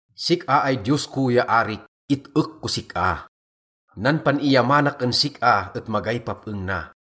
Sik-a ay Diyos ko ya arik, it-ek kos sik-a, nan pan-iyamanak en sik-a et magay pap-eng na.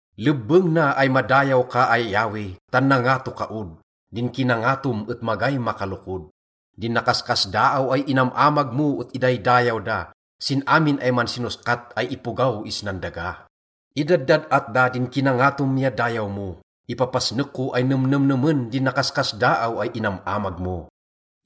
Lebbeng na ay madayaw ka ay Yahweh, tan nangato ka od, din kinangatom et magay makalokod. Din nakaskasdaaw ay inam-amag mo et idaydayaw da sin amin ay mansinoskat ay ipogaw isnan daga. Idaddad-at da din kinangatom ya dayaw mo, ipapasnek ko ay nemnemnemen din nakaskasdaaw ay inam-amag mo.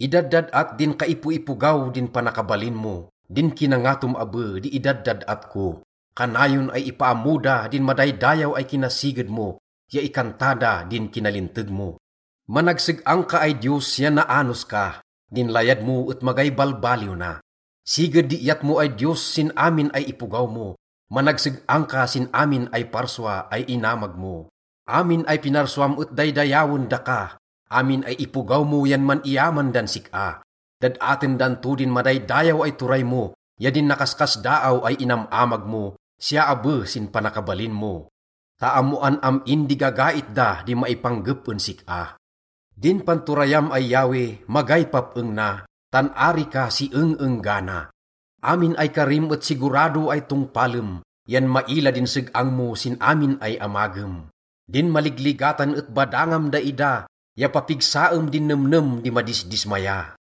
Idaddad-at din kaipoipogaw din panakabalin mo, din kinangatom abe di idaddad-at ko. Kanayon ay ipaammo da din madaydayaw ay kinasiged mo ya ikanta da din kinalinteg mo. Managseg-ang ka ay Diyos ya naanos ka, din layad mo et magay balbaliw na. Siged di iyat mo ay Diyos sin amin ay ipogaw mo, managseg-ang ka sin amin ay parsua ay inamag mo. Amin ay pinarsuam et daydayawen daka, amin ay ipogaw mo yan man-iyaman dan sik-a. Dad-aten dan to din madaydayaw ay turay mo ya din nakaskasdaaw ay inam-amag mo, siya abe sin panakabalin mo, ta ammoan am-in di gagait da di maipanggep en sik-a. Din panturayam ay Yahweh, magay pap-eng na, tan ari ka si eng-enggana. Amin ay karim et sigurado ay tongpalem, yan maila din seg-ang mo sin amin ay amagem. Din maligligatan et badangam daida, ya papigsaem din nemnem di madisdismaya.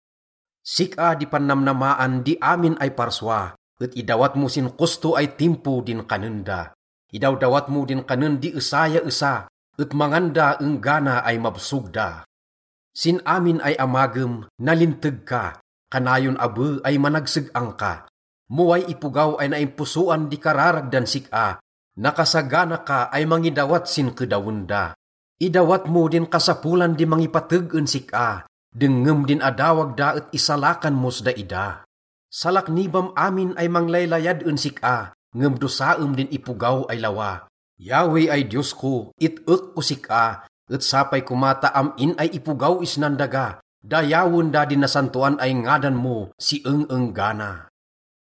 Sik-a di pannamnamaan di amin ay parsua, et idawat mo sin kosto ay timpo din kanen da. Idawdawat mo din kanen di esa ya esa, et mangan da enggana ay mabsog da. Sin amin ay amagem, nalinteg ka, kanayon abe ay managseg-ang ka. Mo way ipogaw ay naimposoan di kararag dan sik-a, nakasagana ka ay mangidawat sin kedawen da. Idawat mo din kasapolan di mangipateg en sik-a, dengngem din adawag da et isalakan mos daida. Salaknibam amin ay manglaylayad en sik-a, ngem dosaem din ipogaw ay lawa. Yahweh ay Diyos ko, it-ek kos sik-a, et sapay koma ta am-in ay ipogaw isnan daga, dayawen da din nasantoan ay ngadan mo si eng-enggana.